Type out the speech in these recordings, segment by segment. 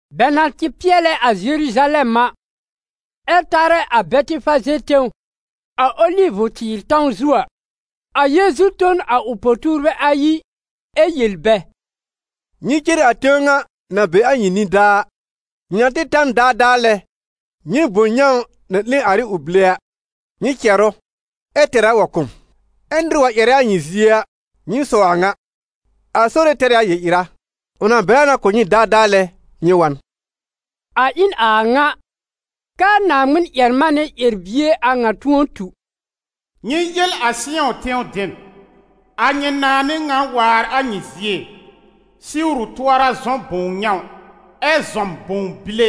Bɛ na tɩ pɩɛlɛ a Zeruzalɛm a, ɛ tarɛ a Bɛtɩfaze tẽw, a Olivʋ-tɩɩr tãw zu a, a Yeezu tõ n a ʋ po-tuurbɛ ayi, ɛ yel bɛ: «Nyɩ cen a tẽw ŋa na be a nyɩ nidaa a, nyɩ na tɩ ta n daadaa lɛ nyɛ̃ bõw nyãw na 'lẽ ar ɩ ʋ bile a, nyɩ cɛr ʋ, ɛ tɛr a wa kʋ̀ m. Ɛ nɩr wa ƴɛrɛ a nyɩ zie a, nyɩɩm sɔw a ŋa: ‹A Sore tɛr ɩ a yel-ɩra.› Ʋ na bɛr a na kʋ̀ nyɩ daadaa lɛ nyɩ wa n. A ɩ n a a ŋa, k'aa Naaŋmɩn-ƴɛr-manɛ ƴɛr-bie a ŋa tʋ̃ɔ tu: ‹Nyɩ yel a Sɩyɔ̃ tẽw dem: a nyɩ nãà n'ɩ ŋan waar a nyɩ zie, siwr ʋ tʋɔra zɔm bõw nyãw, ɛ zɔm bõw bile,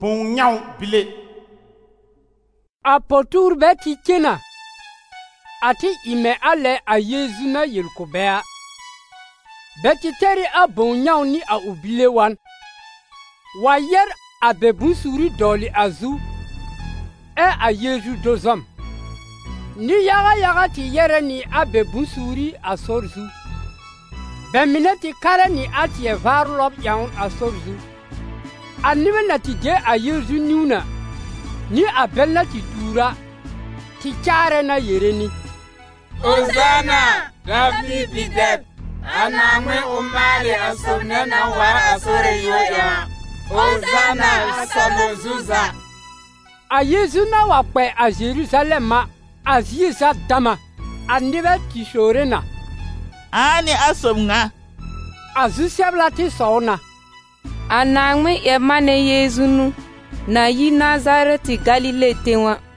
bõw nyãw bile.›» A po-tuurbɛ tɩ cen na, a tɩ ɩ mɛ̃ a lɛ a Yeezu na yel kʋ̀ bɛ a. Bɛ tɩ tɛr ɩ a bõw nyãw nɩ a ʋ bile wa n, wa yɛ́r a bɛ bʋ̃-suuri dɔwlɩ a zu, ɛ a Yeezu do zɔm. Nɩ-yaga yaga tɩ yɛ́rɛ nɩ a bɛ bʋ̃-suuri a sɔr zu; bɛ mɩnɛ tɩ karɛ nɩ a tɩɛ vaar lɔbr ƴãwn a sɔr zu. A nɩbɛ na tɩ de a Yeezu niwn a, nɩ a bɛl na tɩ tuur a, tɩ caarɛ na yere nɩ: «Ozaana a Daviir bi-dɛb! A Naaŋmɩn, ʋ maalɩ a sob nɛ na waar a Sore yúor ƴãw a! Ozaana a salom zu za!» A Yeezu na wa kpɛ a Zeruzalɛm a, a zie za dam a. A nɩbɛ tɩ sowre na: «Ãa n'ɩ a sob ŋa?» A zu-sɛbla tɩ sɔw na: «A Naaŋmɩn-ƴɛr-manɛ Yeezu n'ʋ, na yi Nazarɛtɩ Galile tẽw a.»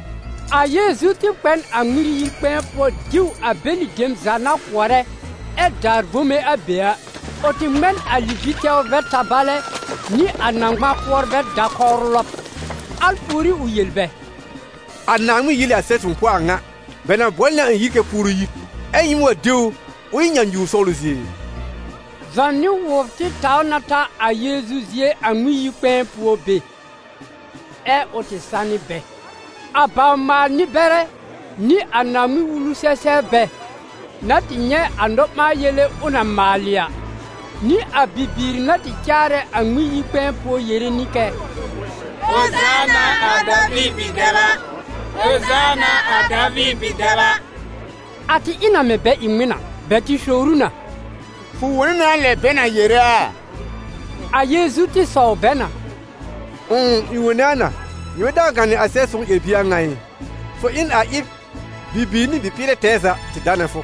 A Yeezu tɩ kpɛ n a Ŋmɩn-yi-kpɛ̃ɛ pʋɔ diw a bɛlɩ dem za na kʋɔrɛ ɛ daar bome a be a; ʋ tɩ ŋmɛ n a libi-tɛwrbɛ tabalɛ nɩ a na-ŋma-kʋɔrbɛ da-kɔwr lɔb. Al pùorí ʋ yel bɛ: «A Naaŋmɩn yel ɩ a Sɛb-sõw pʋɔ a ŋa: ‹Bɛ na bʋɔlɛ nɩ a ɩ̃ yir kɛ puoru yir.› Ɛ nyɩɩm wa de ʋ, ʋ ɩ nyãnyuwr sɔwlʋ zie!» Zɔn nɩ wʋbr tɩ taw na ta a Yeezu zie a Ŋmɩn-yi-kpɛ̃ɛ pʋɔ be, ɛ ʋ tɩ sanɩ bɛ. A bawr-maal-nɩ-bɛrɛ nɩ a Naaŋmɩn-Wulu sɛ-sɛbrbɛ na tɩ nyɛ̃ a nɔ-ɓãa-yele ʋ na maalɩ a, nɩ a bibiir na tɩ caarɛ a Ŋmɩn-yi-kpɛ̃ɛ pʋɔ yere nɩ kɛ: «Ozaana a Daviir bi-dɛb a», a tɩ ɩ na mɛ̃ bɛ ɩ ŋmɩn a. Bɛ tɩ sowr ʋ na: «Fʋ wone nɩ a lɛ bɛ na yere a?» A Yeezu tɩ sɔw bɛ na: «Ʋ̃ʋ ɩ̃ wone a na. Nyɩ bɛ dãw kanɩ a Sɛb-sõw ƴɛr-bie a ŋa ɩ? ‹Fʋ ɩ n a ɩb, bibiir nɩ bɩ-pɩɩlɛ tɛɛ za tɩ danɛ fʋ.›»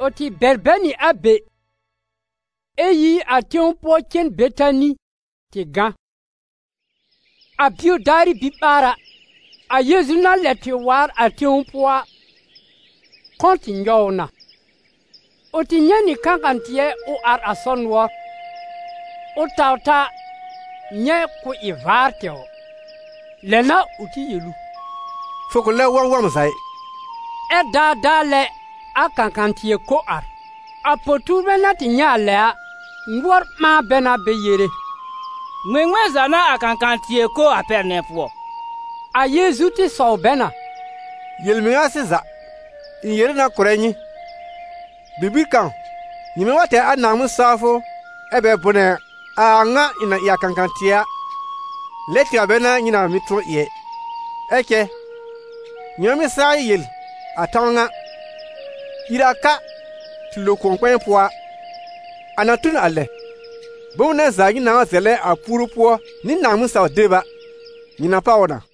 Ʋ tɩ bɛr bɛ nɩ a be, ɛ yi a tẽw pʋɔ cen Betani tɩ gã. A bio daarɩ biɓaara, a Yeezu na tɩ lɛb waar a tẽw pʋɔ a, kɔ̃ tɩ nyɔw ʋ na; ʋ tɩ nyɛ̃ nɩ kãkã-tɩɛ ʋ ar a sɔr nʋɔr, ʋ taw ta nyɛ̃ k'ʋ ɩ vaar tɛwr. Lɛ n'a ʋ tɩ yel ʋ: «Fʋ kʋ̃ lɛ wɔ̃ wɔm za ɩ.» Ɛ daadaa lɛ a kãkã-tɩɛ ko ar. A po-tuurbɛ na tɩ nyɛ̃ a lɛ a, nʋɔr ɓãa bɛ na bɛ yere: «Ŋmɩŋmɩn za n'a a kãkã-tɩɛ ko a pɛr nɛ pʋɔ?» A Yeezu tɩ sɔw bɛ na: «Yel-mɩŋa sɩza, ɩ̃ yere na kʋ̀rɛ nyɩ: bibir kãw nyɩmɛ wa tɛr a Naaŋmɩn-sawfʋ ɛ bɛ bʋnɛ a, a a ŋa ɩ̃ na ɩ a kãkã-tɩɛ a, lɛ tɛwr bɛ n'a nyɩ na mɩ́ tʋ̃ɔ ɩ ɛ, ɛ cɛ nyɩmɛ mɩ̀ saa mɩ́ yel a tãw ŋa: ‹Ìr a ka tɩ lo a kʋ̃ɔ-kpɛ̃ɛ pʋɔ a›, a na tu n a lɛ. Bom nɛ za nyɩ nãà wa zɛlɛ a puoru pʋɔ nɩ Naaŋmɩn-saw-deb a, nyɩ na páw ʋ na.»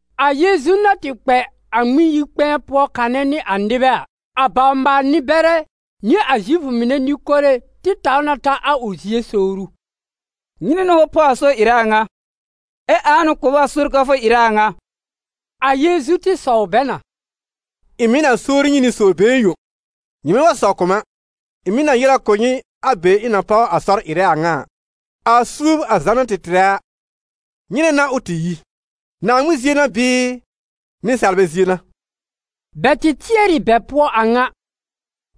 A Yeezu na tɩ kpɛ a Ŋmɩn-yi-kpɛ̃ɛ pʋɔ kanɛ nɩ a nɩbɛ a, a bawr-maal-nɩ-bɛrɛ nɩ a Zifʋ mɩnɛ nɩ-kore tɩ taw na ta a ʋ zie sowr ʋ: «Nyɩnɛ n'a fʋ páw a sɔr ɩrɛ a a ŋa? Ɛ ãa n'ʋ kʋ̀ fʋ a sɔr kɛ fʋ ɩrɛ a a ŋa?» A Yeezu tɩ sɔw bɛ na: «Ɩ̃ mɩ̀ na sowri nyɩ nɩ sowr-been yõ, nyɩmɛ wa sɔw kʋ̀ m a, ɩ̃ mɩ̀ na yel a kʋ̀ nyɩ a be ɩ̃ na páw a sɔr ɩrɛ a a ŋa a. A suob a Zã na tɩ tɩrɛ a, nyɩnɛ n'a ʋ tɩ yi? Naaŋmɩn zie n'a bɩɩ nɩsaalbɛ zie n'a?» Bɛ tɩ tɩɛr ɩ bɛ pʋɔ a ŋa: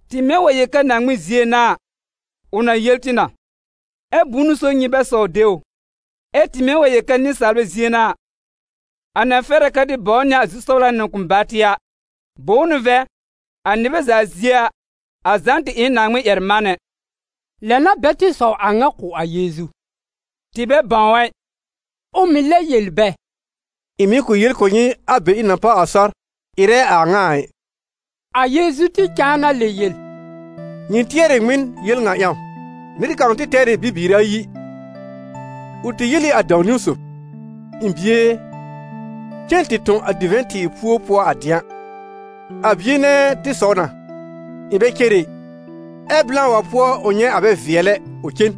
«Tɩmɛ wa yel kɛ Naaŋmɩn zie n'a a, ʋ na yel tɩ na: ‹Ɛ bʋ̃ʋ n'ʋ so nyɩ bɛ saw de ʋ?› Ɛ tɩmɛ wa yel kɛ nɩsaalbɛ zie n'a, a na fɛr a kɛ tɩ bãwnɩ a a zu-sɛbla na kʋ̃ bɛr tɩ a. Bʋ̃ʋ n'ʋ vɛ̃, a nɩbɛ za zie a, a Zã tɩ ɩ n Naaŋmɩn-ƴɛr-manɛ.» Lɛ n'a bɛ tɩ sɔw a ŋa kʋ̀ a Yeezu: «Tɩ bɛ bãw ɛ.» Ʋ mɩ̀ lɛb yel bɛ: «Ɩ̃ mɩ̀ kʋ̃ yel kʋ̀ nyɩ a be ɩ̃ na páw a sɔr ɩrɛ a a ŋa a ɩ.» A Yeezu tɩ cãa na lɛ yel: «Nyɩ tɩɛr ɩ ŋmɩn yel ŋa ƴãw? Nɩr kãw tɩ tɛr ɩ bibiir ayi. Ʋ tɩ yel ɩ a dãw-niwn sob: ‹Ɩ̃ bie e, cen tɩ tõ a divɛ̃-tɩɩr púo pʋɔ a dɩ̃a.› A bie nɛ tɩ sɔw na: ‹Ɩ̃ bɛ cere ɩ›, ɛ blã wa pʋɔ ʋ nyɛ̃ a bɛ vɩɛl ɛ, ʋ cen.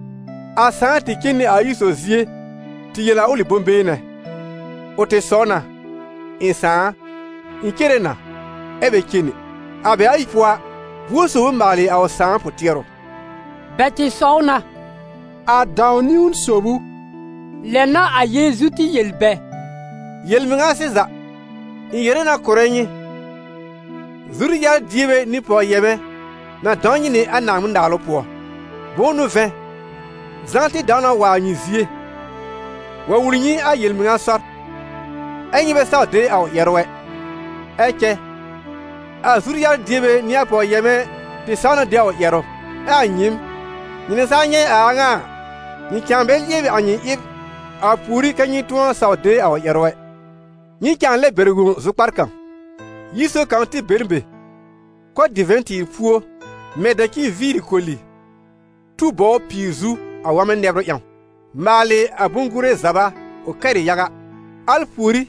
A sãà tɩ cen nɩ a ayi sob zie tɩ yel a ʋlɩ bʋ̃-been nɛ. Ʋ tɩ sɔw na: ‹Ɩ̃ sãà a, ɩ̃ cere na›, ɛ bɛ cen ɛ. A bɛ ayi pʋɔ a, buor sob ʋ maalɩ a ʋ sãà pʋ-tɩɛrʋ?» Bɛ tɩ sɔw na: «A dãw-niwn sob ʋ.» Lɛ n'a a Yeezu tɩ yel bɛ: «Yel-mɩŋa sɩza, ɩ̃ yere na kʋ̀rɛ nyɩ: zuru-yar-dierbɛ nɩ pɔw-yɛmɛ na dãw nyɩ nɩ a Naaŋmɩn-Naalʋ pʋɔ. Bʋ̃ʋ n'ʋ vɛ̃, Zã tɩ dãw na wa a nyɩ zie, wa wul nyɩ a yel-mɩŋa sɔr, ɛ́ nyɩ bɛ saw de a ʋ ƴɛrʋ ɛ; ɛ cɛ a zuru-yar-dierbɛ nɩ a pɔw-yɛmɛ tɩ saw na de a ʋ ƴɛrʋ. Ɛ a nyɩɩm, nyɩ na saa nyɛ̃ a a ŋa a, nyɩ cãa bɛ lɩɛbɩ a nyɩ ɩb a pùorí kɛ́ nyɩ tʋ̃ɔ saw de a ʋ ƴɛrʋ ɛ.» «Nyɩ cãa lɛ bɛr wõ zʋkpar kãw. Yir sob kãw tɩ be n be kɔ divɛ̃-tɩɩr púo, mɛ dacin viiri koli, tuw bɔw pìir zu a wɔmɛ̃ nɛbrʋ ƴãw, maalɩ a bʋ̃-gùre zaba ʋ kɛrɩ yaga; al pùorí,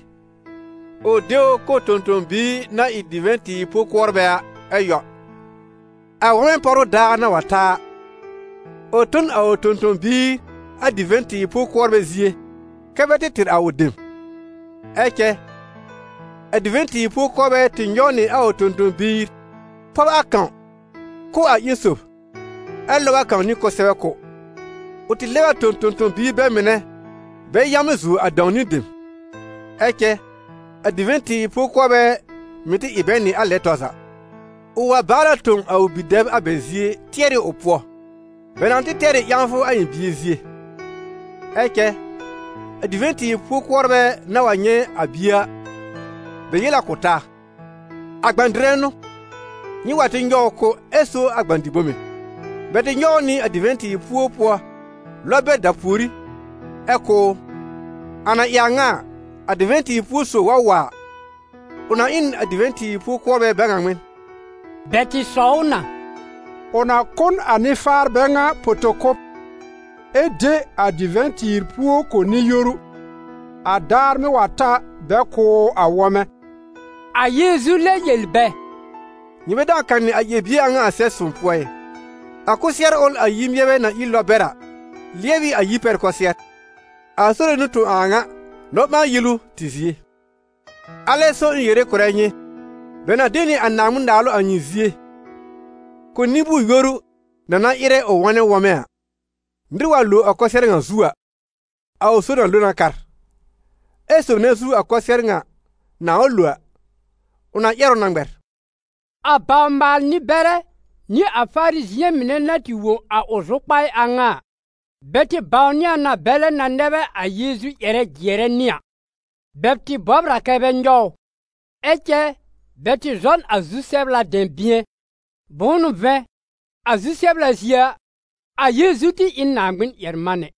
ʋ de ʋ kʋ̀ tõ-tõ-biir na ɩ divɛ̃-tɩɩr po-kʋɔrbɛ a, ɛ yɔ. A wɔmɛ̃ pɔrʋ daar na wa ta a, ʋ tõ n a ʋ tõ-tõ-biir a divɛ̃-tɩɩr po-kʋɔrbɛ zie kɛ́ bɛ tɩ tɩr a ʋ dem. Ɛ cɛ a divɛ̃-tɩɩr po-kʋɔrbɛ tɩ nyɔw nɩ a ʋ tõ-tõ-biir, pɔb a kãw, kʋ́ a ƴẽn sob, ɛ lɔb a kãw nɩ kʋsɛbɛ kʋ́. Ʋ tɩ lɛb a tõ tõ-tõ-biir bɛ mɩnɛ bɛ yãwmɛ̃ zuo a dãw-niwn dem. Ɛ cɛ a divɛ̃-tɩɩr po-kʋɔrbɛ mɩ̀ tɩ ɩ bɛ nɩ a lɛn tɔr za. Ʋ wa báa na tõ a ʋ bi-dɛb a bɛ zie tɩɛr ɩ ʋ pʋɔ: ‹Bɛ na tɩ tɛr ɩ ƴãwfʋ a ɩ̃ bie zie.› Ɛ cɛ a divɛ̃-tɩɩr po-kʋɔrbɛ na wa nyɛ̃ a bie a, bɛ yel a kʋ̀ taa: ‹ A gbã-dɩrɛ n'ʋ. Nyɩ wa tɩ nyɔw ʋ kʋ́ ɛ so a gbã-dɩ-bome!› Bɛ tɩ nyɔw ʋ nɩ a divɛ̃-tɩɩr púo pʋɔ lɔb bɛr da-pùorí, ɛ kʋ́ ʋ. A na ɩ a ŋa a, a divɛ̃-tɩɩr púo sob wa wa a, ʋ na ɩ n a divɛ̃-tɩɩr po-kʋɔrbɛ bɛ ŋa ŋmɩn?» Bɛ tɩ sɔw ʋ na: «Ʋ na kʋ́ n a nɩ-faar bɛ ŋa poto-kʋ́b, ɛ de a divɛ̃-tɩɩr púo kʋ̀ nɩ-yoru, a daar mɩ́ wa ta bɛ kʋ̀ ʋ a wɔmɛ̃.» A Yeezu lɛb yel bɛ: «Nyɩ bɛ dãw kanɩ a ƴɛr-bie a ŋa a Sɛb-sõw pʋɔ ɩ? ‹A kʋsɩɛr ʋl a yir-mɩɛrbɛ na ír lɔb bɛr a, lɩɛb ɩ a yir pɛr kʋsɩɛr, a Sore n'ʋ tõ a a ŋa: nɔ-ɓãa-yel ʋ tɩ zie.› Alɛ so ɩ̃ yere kʋ̀rɛ nyɩ: bɛ na de nɩ a Naaŋmɩn-Naalʋ a nyɩ zie, kʋ̀ nɩ-bʋʋr-yoru na na ɩrɛ ʋ wɔnɛ wɔmɛ̃ a. [ Nɩr wa lo a kʋsɩɛr ŋa zu a, a ʋ sob na lo na kar; ɛ sob nɛ zu a kʋsɩɛr ŋa nãà wa lo a, ʋ na ƴɛr ʋ na ŋmɛr.]» A bawr-maal-nɩ-bɛrɛ nɩ a Farizɩ̃ɛ mɩnɛ na tɩ wõ a ʋ zʋkpaɩ a ŋa a, bɛ tɩ bãwnɩ a na bɛlɛ na nɛ bɛ a Yeezu ƴɛrɛ jɩɛrɛ nɩ a. Bɛ tɩ bɔbr a kɛ bɛ nyɔw ʋ, ɛ cɛ bɛ tɩ zɔ n a zu-sɛbla dɛ̃bɩ̃ɛ, bʋ̃ʋ n'ʋ vɛ̃, a zu-sɛbla zie a, a Yeezu tɩ ɩ n Naaŋmɩn-ƴɛr-manɛ.